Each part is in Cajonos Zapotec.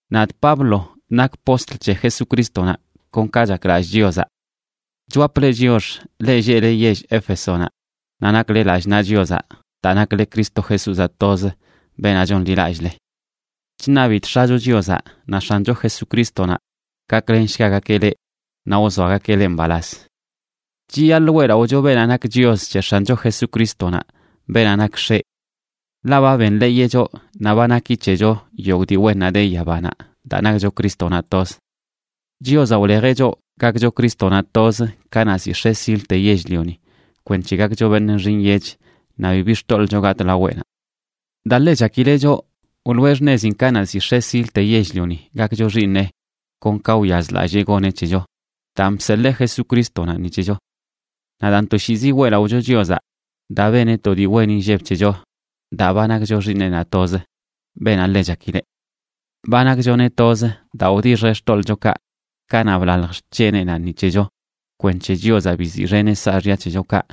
Nadꞌ Pablo nakꞌ postl c̱he Jesucrístonaꞌ kon ka chaklallꞌ Chiozaꞌ. Chwapꞌ leꞌ chiox, leꞌ lleꞌle yell Éfesonaꞌ, naꞌ nakle lallꞌ naꞌ Chiozaꞌ daa nakle Cristo Jesúzaꞌ toz, beenaꞌ chonḻilallꞌle. Chṉabidꞌ X̱acho Chiozaꞌ naꞌ X̱ancho Jesucrístonaꞌ gaklenshgagakeꞌ leꞌ naꞌ wzoagakeꞌ leꞌ mbalaz. Chiyaḻꞌ weꞌlaꞌocho beenaꞌ nak Chios c̱he X̱ancho Jesucrístonaꞌ, beenaꞌ nak X̱eꞌ. Ḻaꞌ ba benḻeeyeꞌ choꞌ naꞌ ba naki c̱hecho yogꞌ dii wennaꞌ de yabanaꞌ, daa nakcho Crístonaꞌ toz. Chiozaꞌ wlejeꞌ choꞌ gakcho Crístonaꞌ toz kanaꞌ ziꞌ x̱e silte yell-lioni kwenc̱he gakcho beṉꞌ nxi nyech naꞌ bibi xtoḻꞌcho gatꞌ laweꞌnaꞌ. Daa ḻe chakileꞌ choꞌ, wloꞌe xṉezin kanaꞌ ziꞌ x̱e silte yell-lioni gakcho xiiṉeꞌ kon ka wyazlallee goneꞌ c̱hecho, daan bseḻee Jesucrístonaꞌ ni c̱hecho. Naꞌ daan, toshiizi weꞌlaꞌocho Chiozaꞌ daa beneꞌ to dii wen inlleb c̱hecho daa ba nakcho Xiiṉeꞌnaꞌ toz, beenaꞌ ḻe chakileꞌ. Ba nakchoneꞌ toz daa wdixjeꞌ xtoḻꞌchokaꞌ kanaꞌ blalj xc̱heneꞌnaꞌ ni c̱hecho kwenc̱he Chiozaꞌ biziꞌxeneꞌ saaxya c̱hechokaꞌ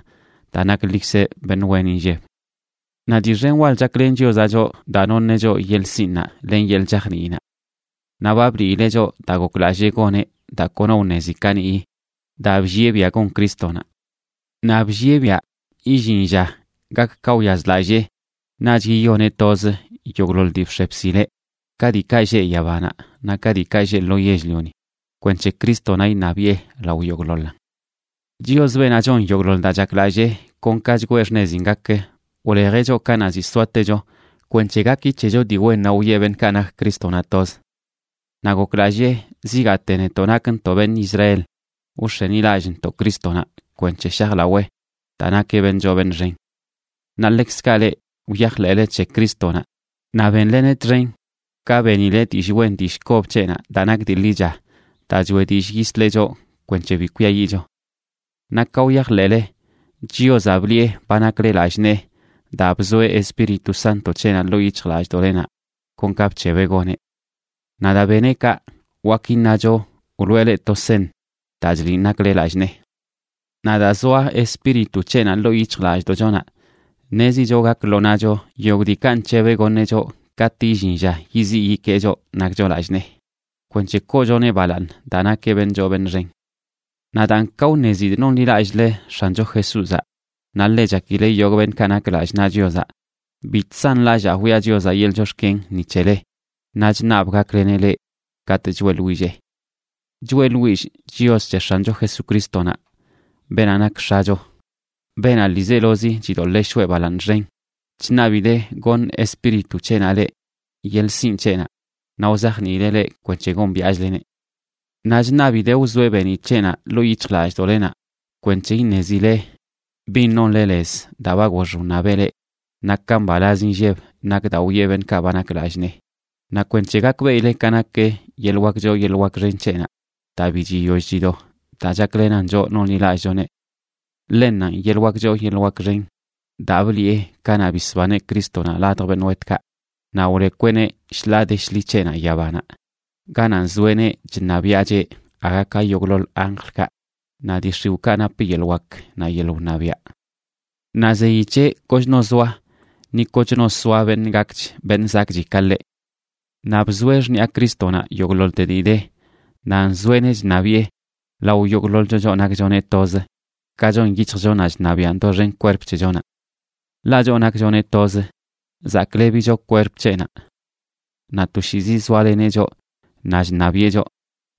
daa naklikzeꞌ beṉꞌ wen inlleb. Naꞌ dii xen wal chaklen Chiozaꞌ choꞌ daa noṉeꞌ choꞌ yeḻꞌ sinꞌnaꞌ len yeḻꞌ chajniinaꞌ. Naꞌ ba bliileꞌ choꞌ daa goklallee goneꞌ daa kono wṉezi kaniꞌyi, daa bllieꞌ biaꞌ gon Crístonaꞌ. Naꞌ bllieꞌ biaꞌ illin lla gak ka wyazlallee naꞌch yiyoneꞌ toz yogꞌḻoḻ dii bx̱e bsileꞌ, ka diikaꞌ lleꞌ yabanaꞌ naꞌ ka diikaꞌ lleꞌ lo yell-lioni, kwenc̱he Crístonaꞌ iṉabiꞌe lao yogꞌḻoḻan. Chios, beenaꞌ chon yogꞌḻoḻ daa chaklallee kon ka chgwee xṉezin gak, wlejeꞌ choꞌ kanaꞌ ziꞌ soatecho kwenc̱he gaki c̱hecho dii wennaꞌ wiꞌe beṉꞌkaꞌ nak Crístonaꞌ toz. Naꞌ goklallee zigaate netoꞌ nakntoꞌ beṉꞌ Israel wx̱enilallꞌntoꞌ Crístonaꞌ kwenc̱he shajlawee daa nakeꞌ beṉꞌ choo beṉꞌ xen. Naꞌ ḻekzkaꞌ leꞌ, wyajḻeꞌle c̱he Crístonaꞌ naꞌ bénleneꞌ txen ka benile dillꞌ wen dillꞌ kob c̱heꞌnaꞌ daa nak dii ḻicha daa choeꞌ dillꞌ yisleꞌ choꞌ kwenc̱he bi kwiayiꞌcho. Naꞌ ka wyajḻeꞌle, Chiozaꞌ bliꞌe ba nakle lallꞌ nee daa bzoeꞌ Espíritu Sánto c̱heꞌnaꞌ ḻoo yic̱hjlallꞌdoꞌlenaꞌ kon ka bc̱hebeꞌ goneꞌ. Naꞌ daa beneꞌ kaꞌ, wak iṉacho wloꞌe leꞌ to seṉ daa chliꞌn nakle lallꞌ nee. Naꞌ daa zoa Espíritu c̱heꞌnaꞌ ḻoo yic̱hjlallꞌdoꞌchonaꞌ, ṉezicho gak lo naꞌcho yogꞌ diikaꞌ nc̱hebeꞌ goṉeꞌ choꞌ katꞌ illin lla yiziꞌ yikee choꞌ nakcho lallꞌ nee, kwenc̱he koochoneꞌ balaaṉ daa nakeꞌ beṉꞌ choo beṉꞌ xen. Naꞌ daan, ka wṉezidꞌ nonḻilallꞌle X̱ancho Jesúzaꞌ naꞌ ḻe chakileꞌ yogꞌ beṉꞌkaꞌ nak lallꞌ naꞌ Chiozaꞌ, bi chsanlallaa wiꞌa Chiozaꞌ yeḻꞌ chox̱ken ni c̱hele naꞌ chṉabꞌ gakleneꞌ leꞌ katꞌ choeꞌḻwillee. Choeꞌḻwillꞌ Chios c̱he X̱ancho Jesucrístonaꞌ, beenaꞌ nak X̱acho, beenaꞌ ḻiizelozi chidoḻee shoꞌe balaaṉ xen, chṉabidee goṉ Espíritu c̱heꞌnaꞌ leꞌ yeḻꞌ sinꞌ c̱heꞌnaꞌ naꞌ wzajniileꞌ leꞌ kwenc̱he gombiaꞌchleneꞌ. Naꞌ chṉabidee wzoeꞌ beeniꞌ c̱heꞌnaꞌ ḻoo yic̱hjlallꞌdoꞌlenaꞌ kwenc̱he iṉezile bin nonle lez daa ba gox wṉabeꞌ leꞌ, naꞌ ka mbalaz inlleb nak daa wiꞌe beṉꞌkaꞌ ba nak lallꞌ nee, naꞌ kwenc̱he gakbeꞌile ka nak yeḻꞌ wak choo yeḻꞌ xen c̱heꞌnaꞌ daa bi chiyoll chido daa chaklenan choꞌ nonḻilallꞌchoneꞌ. Ḻennanꞌ yeḻꞌ wak choo yeḻꞌ wak xen daa bliꞌe kanaꞌ bisbaneꞌ Crístonaꞌ ladj beṉꞌ wetkaꞌ naꞌ wlekweꞌneꞌ shḻaa de shḻi c̱heꞌnaꞌ yabanaꞌ, ganaꞌ nzoeꞌneꞌ chṉabiaꞌcheꞌ aga ka yogꞌḻoḻ anjlkaꞌ naꞌ dii x̱iwꞌkaꞌ nap yeḻꞌ wak naꞌ yeḻꞌ wṉabiaꞌ. Naꞌ zeyi c̱heꞌ kochno zoa, ni kochno soa, beṉꞌ gakch beṉꞌ zakꞌchi ka ḻeꞌ. Naꞌ bzoeꞌ xṉiꞌa Crístonaꞌ yogꞌḻoḻte dii de, naꞌ nzoeꞌneꞌ chṉabiꞌe lao yogꞌḻoḻcho choꞌ nakchoneꞌ toz, ka chon yic̱hjchonaꞌ chṉabiꞌan doxen kwerp c̱hechonaꞌ. Ḻaꞌ choꞌ nakchoneꞌ toz, zaklebicho kwerp c̱heꞌnaꞌ. Naꞌ toshiizi zoaleneꞌ choꞌ naꞌ chṉabiꞌe choꞌ,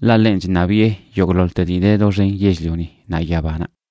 ḻaꞌ ḻenꞌ chṉabiꞌe yogꞌḻoḻte dii de doxen yell-lioni naꞌ yabanaꞌ.